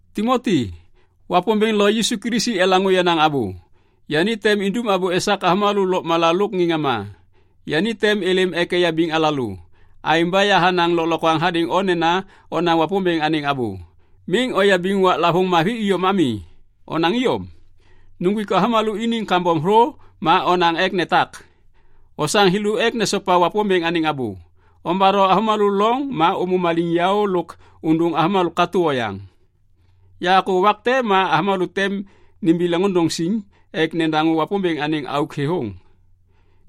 Timoti, Wapômbêŋ lo Yisu Kilisi elaŋô yenaŋ abô. Yani tem indum abô esak avômalô lôkmala lôk ŋê ŋama. Yani tem êlêm ek eyabiŋ alalô. Aêŋ ba yahanaŋ lôklokwaŋ hadêŋ o nena onaŋ Wapômbêŋ anêŋ abô. Miŋ oyabiŋ waklavôŋ mavi iyom ami. Onaŋ iyom. Nuŋgwik avômalô iniŋ kambom thô ma onaŋ ek netak. Osaŋ thêlô ek nesopa Wapômbêŋ anêŋ abô. Ombatho avômalô loŋ ma ômô maliŋyaô lôk ôndôŋ avômalô katô oyaŋ. Yakô wak te ma avômalô tem nimbi leŋôndôŋ siŋ ek nedaŋô Wapômbêŋ anêŋ auk thêthôŋ.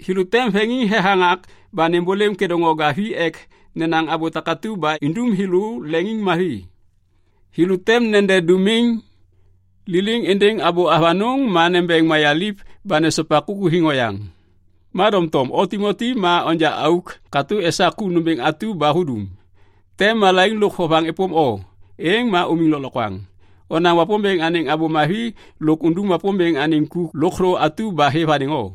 Thêlô tem veŋiŋ thethaŋak ba nêmbôlêm kêdôŋwaga vi ek nenaŋ abô takatu ba indum thêlô leŋiŋmavi. Thêlô tem nede dômiŋ liliŋ êndêŋ abô avanôŋ ma nembeŋ mayaliv ba nesopa kukuthiŋ oyaŋ. Ma doŋtom o Timoti ma onja auk katô esak ku nômbêŋ atu ba hudum. Tem malaiŋ lôk vovaŋ êpôm o. Êŋ ma umiŋ lôklokwaŋ. Onaŋ Wapômbêŋ anêŋ Abô Mavi lôk undum Wapômbêŋ anêŋ ku lôkthô atu ba hêv hadêŋ o.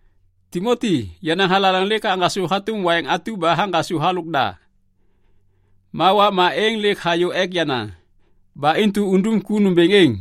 Timoti, yenaŋ thalaleŋ lêk haŋgasô hatôm waiŋ atu ba haŋgasô halôk da. Ma wakma êŋ lêk hayô ek yana. Ba intu undum ku nômbêŋ êŋ.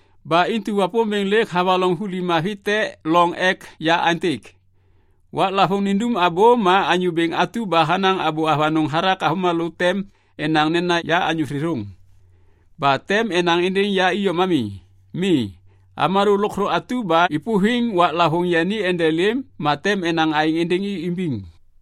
Ba intu Wapômbêŋ lêk havaloŋ vuli mavi te loŋ ek ya aêntêk. Waklavôŋ nindum abô ma Anyô Bêŋ atu ba hanaŋ abô avanôŋ hathak avômalô tem enaŋ nena ya anyô thêthôŋ. Ba tem enaŋ êndêŋ ya iyom ami. Mi. Avômalô lôkthô atu ba êpôviŋ waklavôŋ yani endelêm ma tem enaŋ aêŋ êndêŋ i imbiŋ.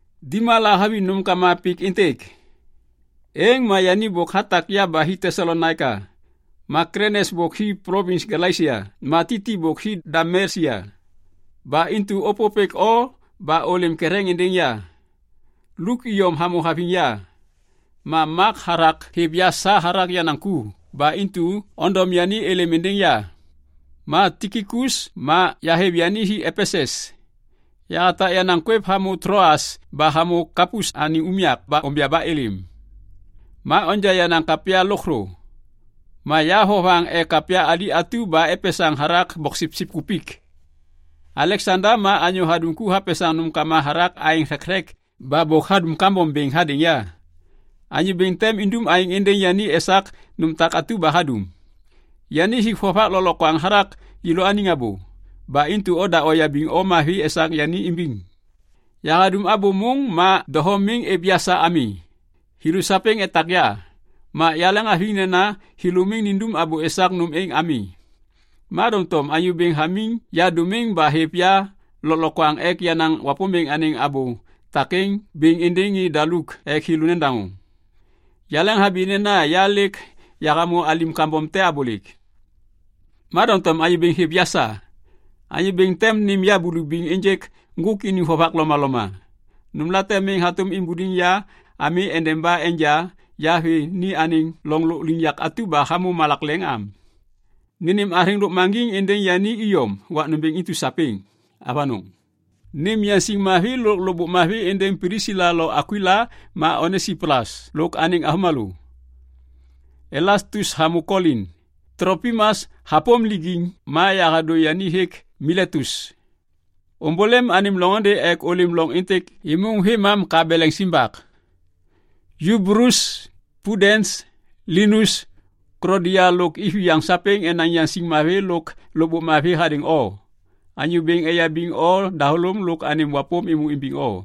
Dima lahaviŋ nômkama pik êntêk. Êŋ ma yani bôk hatak ya ba hi Tesalonaika. Ma Klesens bôk hi plovins Galesia ma Titi bôk hi Dalmesia. Ba intu ôpôpêk o ba ôlêm ketheŋ êndêŋ ya. Luk iyom hamô haviŋ ya. Ma Mak hathak hêv ya sa hathak yenaŋ ku ba intu ondom yani êlêm êndêŋ ya. Ma Tikikus ma yahêv yani hi Epesus. Yahatak yenaŋ kwêv hamô Tloas ba hamô Kapus anêŋ unyak ba onja ba êlêm. Ma onja yenaŋ kapya lôkthô. Ma ya vovaŋ ek kapya ali atu ba epesaŋ hathak boksipsip kupik. Aleksanda ma anyô hadum ku hapesaŋ nômkama hathak aeŋ thekthek ba bôk hadum kambom bêŋ hadêŋ ya. Anyô Bêŋ tem indum aêŋ êndêŋ yani esak nôm atu ba hadum. Yani hik vovak lôklokwaŋ hathak yêlôaniŋ abô. Ba intu oda oyabiŋ o mavi esak yani imbiŋ. Yahadum abô môŋ ma doho miŋ êv ya sa ami. Thêlô sapêŋ etak ya. Ma yaleŋhaviŋ nena thêlô miŋ nindum abô esak nôm êŋ ami. Ma doŋtom Anyô Bêŋ hamiŋ ya dômiŋ ba hêv ya lôklokwaŋ ek yanaŋ Wapômbêŋ anêŋ abô takêŋ bêŋ êndêŋ ŋê daluk ek thêlô nedaŋô. Yaleŋhabi nena ya lêk yahamô alim kambom te abôlêk. Ma doŋtom Anyô Bêŋ hêv ya sa. Anyô Bêŋ tem nêm ya bulubiŋ ênjêk ŋgôk iniŋ vovak lomaloma. Nômlate miŋ hatôm imbuliŋ ya ami endeba enja ya vê ni anêŋ loŋ lôkliŋyak atu ba hamô malak leŋ am. Nênêm athêŋ lôkmaŋgiŋ êndêŋ yani iyom wak nômbêŋ intu sapêŋ. Avanôŋ. Nêm yaŋsiŋ mavi lôk lôkbôk mavi êndêŋ Plisila lo Akwila ma Onesipolus lôk anêŋ avômalô. Elastus hamô Kolin. Tlopimas hapôm lijiŋ ma yahadô yani hêk Miletus. Ômbôlêm anêm loŋôndê ek ôlêm loŋ êntêk êmôŋ vêmam ka beleŋ simbak. Yubulus, Pudens, Linus, Klodia lôk iviyaŋ sapêŋ enaŋ yaŋsiŋ mavi lôk lôkbôk mavi hadêŋ o. Anyô Bêŋ eyabiŋ o dahôlôm lôk anêŋ wapôm êmô imbiŋ o.